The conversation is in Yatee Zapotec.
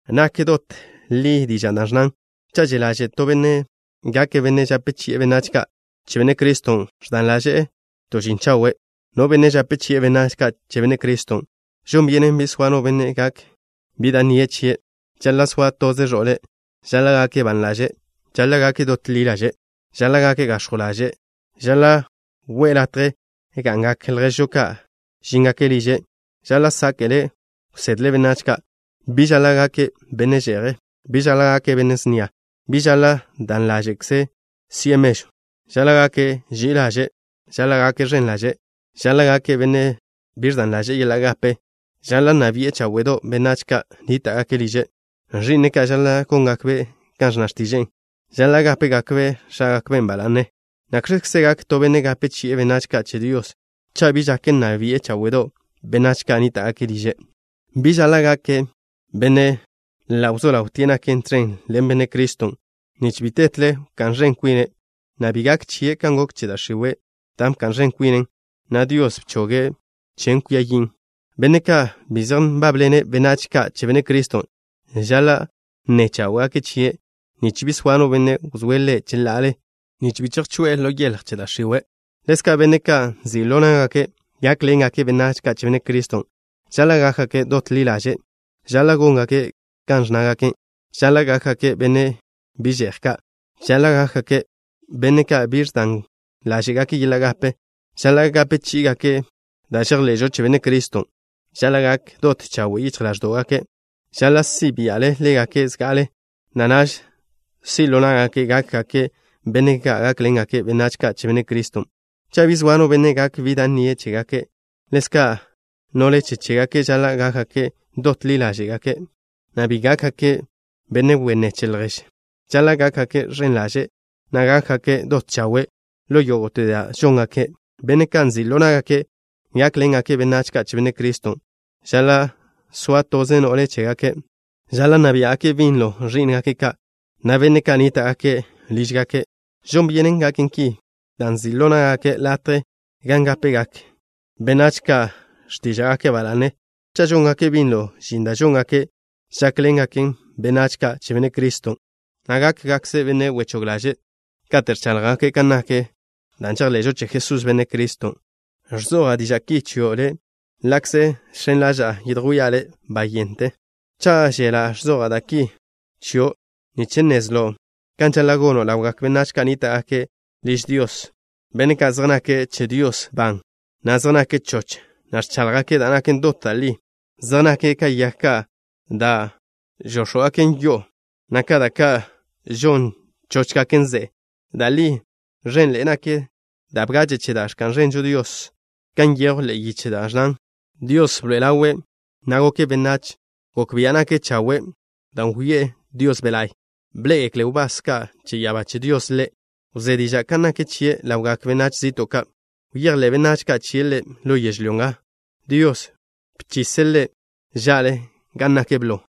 Nak dot da' li dižan' dan' ẕnnan: “Cha' že' ḻaže' to benne' gake' benne' žape chi'e benách ka' che Benne' Criston', ẕdan ḻaže'e to žin chawe'.” No benne' žape chi'e benách ka' che Benne' Criston': Žon byenen bi soa no benne' gak bi da' nnie' chie'. Žaḻa' soa toze ẕo'le. Žaḻa' gake' ban ḻaže'. Žaḻa' gake' dot ḻi ḻaže'. Žaḻa' gake' gax̱jw ḻaže'. Žaḻa' wi'e latje gan ga'ngak lježžo ka' žíngake' liže'. Žaḻa' sáke'le' wsedle' benách ka'. Bi žaḻa' gake' benne' že'je'. Bi žaḻa' gake' benne' snia. Bi žaḻa' dan ḻáže'ze' si'e mežw. Žaḻa' gake' ži'i ḻaže'. Žaḻa' gake' ẕen ḻaže'. Žaḻa' gake' benne' bi ẕdan ḻaže'e yeḻa' gape. Žaḻa' nna bi'e cháwe'do' benách ka' nníta'gake' liže'. Ẕi'ne' ka' žaḻa' góngakbe' kan ẕnna x̱tiže'e. Žaḻa' gápegakbe' x̱ágakben' ba la'ne. (¿Nakx̱kze gak to benne' gape chi'e benách ka' che Dios cha' bi žak nna bi'e cháwe'do' benách ka' nníta'gake' liže'?) Bi žaḻa' gake' benne' ḻa' wzó ḻawtie' nake' tẕen ḻen Benne' Criston', nich bi tetle wká'n ẕen kwine', na' bi gak chie' kan gok che da' x̱iwe', dan' bka'n ẕen kwinen, na' Dios bchoge' chen kwia yin'. Benne' ka' bi zej nbábḻene' benách ka' che Benne' Criston', žaḻa' nne cháwe'gake' chie' nich bi soa no benne' wzóe' ḻe' cheḻa'ale, nich bi chejžeje' ḻo yeḻj che da' x̱iwe'. Ḻezka' benne' ka' nzi' ḻo ná'gake' gákḻengake' benách ka' che Benne' Criston': Žaḻa' gákgake' dot ḻi ḻaže'. Žaḻa' góngake' kan ẕnnágake'. Žaḻa' gákgake' benne' bi že'j ka'. Žaḻa' gákgake' benne' ka' bi ẕdángake' yeḻa' gape. Žaḻa' gape chí'igake' da' žejḻe'žo che Benne' Criston'. Žaḻa' gak dot chawe' yichj ḻáẕdo'gake'. Žaḻa' si' bia'le ḻégake' zga'ale, na' naž si' ḻo ná'gake' gákgake' benne' ka' gákḻengake' benách ka' che Benne' Criston', cha' bi zoa no benne' gak bi da' nnie' chégake'. Ḻezka', no'le che chégake' žaḻa' gákgake' dot ḻi ḻáže'gake', na' bi gákgake' benne' wenné che lježe'. Žaḻa' gákgake' ẕen ḻaže', na' gákgake' dot chawe' ḻo yógo'te da' žóngake'. Benne' ka' nzi' ḻo ná'gake' gákḻengake' benách ka' che Benne' Criston': Žaḻa' soa toze no'le che chégake'. Žaḻa' nna biá'gake' binlo ẕí'ngake' ka', na' benne' ka' nníta'gake' lížgake' ka'. Žon byenen gaken ki, dan' nzi' ḻo ná'gake' latje gan gápegak benách ka' x̱tíža'gake' ba la'ne, cha' žóngake' binlo žin da' žóngake' žákḻengake' benách ka' che Benne' Criston', na' gákgakže' benne' wechóg ḻaže' kate' ẕcháḻjgake' kan nak da' žejḻe'žo che Jesús, Benne' Criston'. Ẕzoja' diža' ki chio' le', ḻa'kze žx̱en ḻaža'a yedjwía' le' bayente. Cha' wžela', ẕzoja' da' ki chio' nich nnezlo' kan žaḻa' gono' ḻawgak benách ka' nníta'gake' liž Dios, benne' ka' zej nake' che Dios ban, na' zej nake' choch, na' ẕcháḻjgake' da' naken dot da' li. Zej nake' ka yag ka' da' žóx̱gaken yo'o, na' ka da' ka' žon chóchgaken ze'e. Da' li, ẕenḻe'e nak da' bgache' che da' ẕka'n ẕenžo Dios, kan nyejw ḻe'e yiche da' ẕnnan: Dios bḻoe'e ḻawe', na' goke' benách. Gok bia' nake' chawe' dan' wyoé'e Dios Be' La'y. Bḻé'egekle wbás ka' che ya'abá che Dios Ḻe'. Wzé diža' kan nak chie' ḻawgak benách zi'to' ka'. Bejḻe'gak benách ka' chie' Ḻe' ḻo yežlyó nga. Dios bchise' Ḻe' ža'le gan nake' blo.